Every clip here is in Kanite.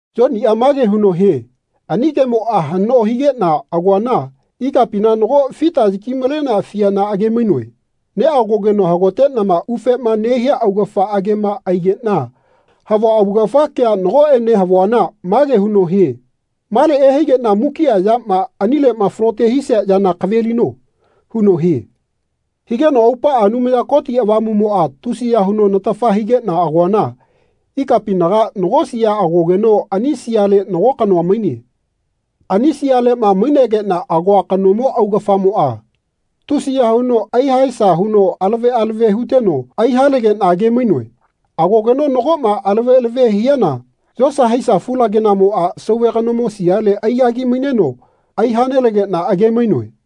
Yoniꞌa mage huno hie ani kemoꞌa haꞌnoma higeꞌna agoana ikapina nago fita yaki-malenea fiana age-mainoe. Neꞌagogeno hagoteꞌnama ufema nehia augafa agema aigeꞌna havua augafa kea nagoꞌene havuana mage huno hie “Male ehaigeꞌna mukiꞌa yama anileꞌma falote hisia yana kavelino.” huno hie. Higeno aupaꞌa Anumaya Koti Avamuꞌmoꞌa tusiya huno natafa higeꞌna agoana ikapinaga nago sia agogeno ani siale nago kanoa maine. Ani sialeꞌma mainegeꞌna agoa kanomo augafamoꞌa tusiya huno aihaesa huno alave alave huteno aihalegeꞌna age-mainoe. Agogeno nagoꞌma alave alave hiana yosa haisa fulagenaꞌmoꞌa sauve kanomo siale aigagi-maineno aihanelegeꞌna age-mainoe.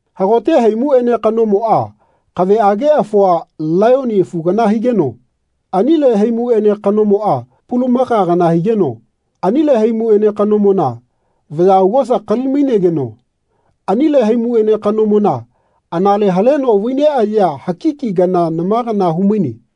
Hagote haimuꞌene kanomoꞌa kaveꞌage afua, laiyoni afu kana higeno anile haimuꞌene kanomoꞌa pulamaka kana higeno anile haimuꞌene kanomona vaya augosa kali-maigeno anile haimuꞌene kanomona anale haleno vai neꞌayea haki kana nama kana humaine.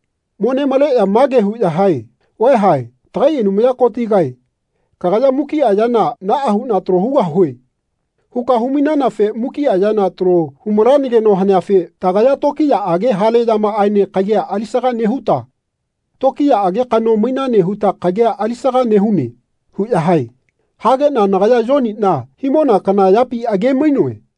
Mo nemaleꞌya mage huꞌya hae “Vaeha tagai Anumaya Kotigae kagaya mukiꞌa yana ‘Naꞌa huꞌna talo hugahue.’ huka humainanafe mukiꞌa yana talo hu-malanageno haneafe tagaya tokiyaꞌage hale yamaꞌaene kagia alisaga nehuta tokiyaꞌage kano mainane huta kagia alisaga nehune.” huꞌya hae. Hageꞌna nagaya Yoniꞌna himona kana yapi age-mainoe.